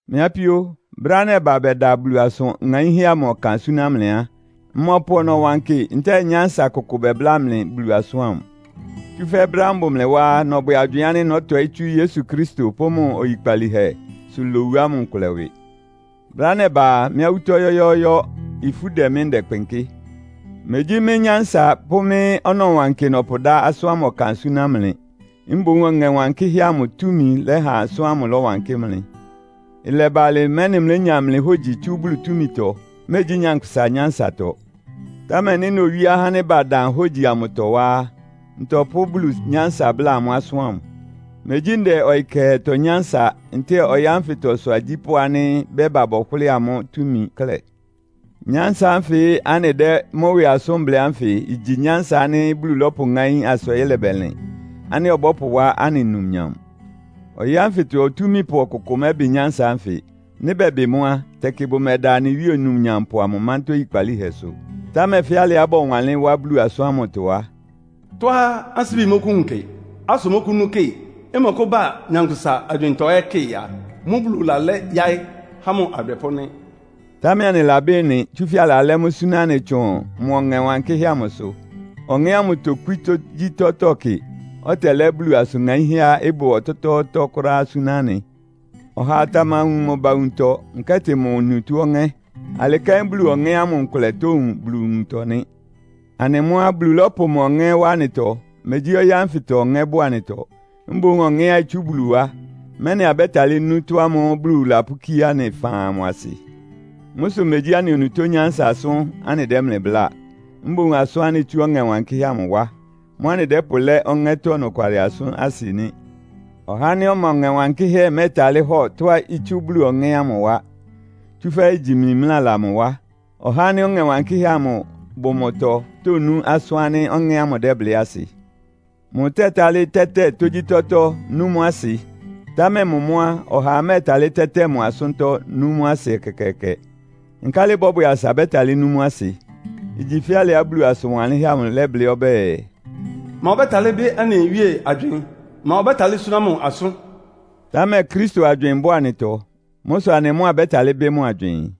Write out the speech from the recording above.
Mɩ́ apíó, brɛ́á nɛba bɛda Bulu asʋn ŋaínhɛ́ amʋ ɔkan súná mlɩ á, mmɔpʋ ɔnɔwankɩ ntɛ́ɛ nyánsa kʋkʋ bɛbláa mlɩ Bulu asʋ́n ámʋ. Tsúfɛ́ brɛ́á mbʋ mlɩ wá á, nɔbwɛ agywɩɩn ánɩ́ nɔ́tɔɩ́ tsú Yesu Kristo pʋ́ mʋ oyikpalíhɛsʋ lowu nkʋlɛ ɩwɩ. Brɛ́á nɛba a, mɩ́ awútɔ́ yɔ́yɔ́ɔ́yɔ́. Ifú dɛ mɩ́, ndɛkpɩnkɩ́. Megyí mɩ́ nyánsa pʋ́ mɩ́ ɔnɔwankɩ nɔpʋdá asʋ́n ámʋ ɔkan súná mlɩ. Mboún Ɔŋɛ́ Wankɩ́hɛ́ amʋ túmi lɛ́ha asʋ́n ámʋ ɩlɔwankɩ́ mlɩ. Ɩlɛba alɩ, mɛ́nɩ mlénya mlɩ hógyi tsú Bulu túmitɔ, megyí nyankpʋsa nyánsatɔ. Támɛ nɩ́ nowíé ahá ánɩ́ badan hógyi amʋtɔ wá á, ntɔpʋ́ Bulu nyánsa bláa amʋ́ asʋ́n amʋ́. Megyí ndɛ ɔyɩ kɛhɛtɔ nyánsa, ntɛ́ɛ ɔyɩ́ ánfɩtɔ ɩsʋ agyípʋ́ ánɩ́ bɛ́ba bɔhʋlɩ́ɩ amʋ́ túmi klɛ́. Nyánsa ánfɩ anɩdɛ́ mʋ́ ɩwɩ asʋ́n blɩ́ ánfɩ igyi nyánsa ánɩ́ Bulu lɔ́pʋŋáín asa ɔyɩ́ lɛbɛlɩn, ánɩ́ ɔbɔ́pʋwá anɩ numnyam. Ɔyɩ́ ánfɩtɔ otúmípʋ ɔkʋkʋ mɛ́bɩ nyánsa ánfɩ. Nɩ́ bɛbɩ mʋ́ á, tɛkɩ bʋmɛda anɩ Wíe Onumnyampʋ amʋ mántá oyikpalíhɛsʋ. Támɛ fɛ́ alɩá bɔwanlɩ́n wá Bulu asʋ́n ámʋtɔ á, “Tɔ́á ansíbi mɔkʋ́wun kɩ, asʋ mɔ́kʋ́nú kɩ, ɩmɔkʋ́ba nyankpʋsa agywɩɩntɔ ɛ́ kɩ a, mʋ́ Bulu lalá yáɩ́ há mʋ adwɛpʋ́ nɩ́.” Támɛ anɩlabɩ́ ɩ́nɩ, tsúfɛ́ alalɛ́ mʋ́ súná anɩ tsʋn mʋ Ɔŋɛ Wankɩ́hɛ́ amʋsʋ. Ɔŋɛ́ ámʋ tokwí tógyítɔ́tɔ́ kɩ, ɔtɛlɛ́ Bulu asʋn ŋaínhɛ́á ɩbʋ ɔtɔ́tɔ́ɔ́tɔ́ kʋ́ráá súná anɩ. Ɔhaa tamawun mʋ ba nwuntɔ, nkɛ́tɩ mʋ onutó ɔŋɛ́. Alɩ kɛ́n Bulu Ɔŋɛ́ ámʋ nkʋlɛ tówun Bulu nwuntɔ nɩ́. Anɩ mʋ́ á, Bulu lɔ́pʋ mʋ Ɔŋɛ́ wá anɩtɔ, megyí ɔyɩ́ ánfɩtɔ ɔŋɛ́ bʋ anɩtɔ. Mboún Ɔŋɛ́á itsú Bulu wá, mɛ́nɩ abɛ́talɩ́ nú ɩtɔ́ ámʋ́ʋ́ Bulu lapʋ́kíé anɩ faan amʋ asɩ. Mʋ́ sʋ megyí anɩ onutó nyánsa asʋ́n anɩdɛ́ mlɩ bláa. Mboún asʋ́n ánɩ́ itsú Ɔŋɛ́ Wankɩ́hɛ́ ámʋ wá. Mʋ́ anɩdɛ́pʋlɛ́ Ɔŋɛ́tɔ́ ɔnɔkwalɩ asʋ́n asɩ nɩ́. Ɔhá ánɩ́ ɔma Ɔŋɛ́ Wankɩ́hɛ́ mɛ́ɛtalɩ́ hɔ tɔ́á itsú Bulu Ɔŋɛ́ ámʋ wá, tsúfɛ́ igyi mimlála mʋ wá. Ɔhá ánɩ́ Ɔŋɛ Wankɩ́hɛ́ bʋ mʋtɔ tónú asʋ́n ánɩ́ Ɔŋɛ́ ámʋ dɛ́blɩ́ asɩ. Mʋtɛtálɩ́ tɛ́tɛ tógyítɔ́tɔ́ nú mʋ́ asɩ. Támɛ mʋ mʋ́ á, ɔhaa mɛ́ɛtalɩ́ tɛ́tɛ mʋ asʋ́ntɔ́, nú mʋ asɩ ɛkɛkɛɛkɛ. Nkálɩ ɩbɔ́bwɛ asa bɛ́talɩ́ nú mʋ́ asɩ? Igyi fɛ́ alɩá Bulu asʋn wanlɩ́nhɛ́ amʋ lɛ́blɩ́ ɔbɛ́ɛ, “Ma ɔbɛ́talɩ́ bɩ́ anɩ Wíe agywɩɩn? Ma ɔbɛ́talɩ́ súná mʋ asʋ́n?” Támɛ Kristo agywɩɩn bʋ anɩtɔ. Mʋ́ sʋ anɩ mʋ́ abɛ́talɩ́ bɩ́ mʋ agywɩɩn.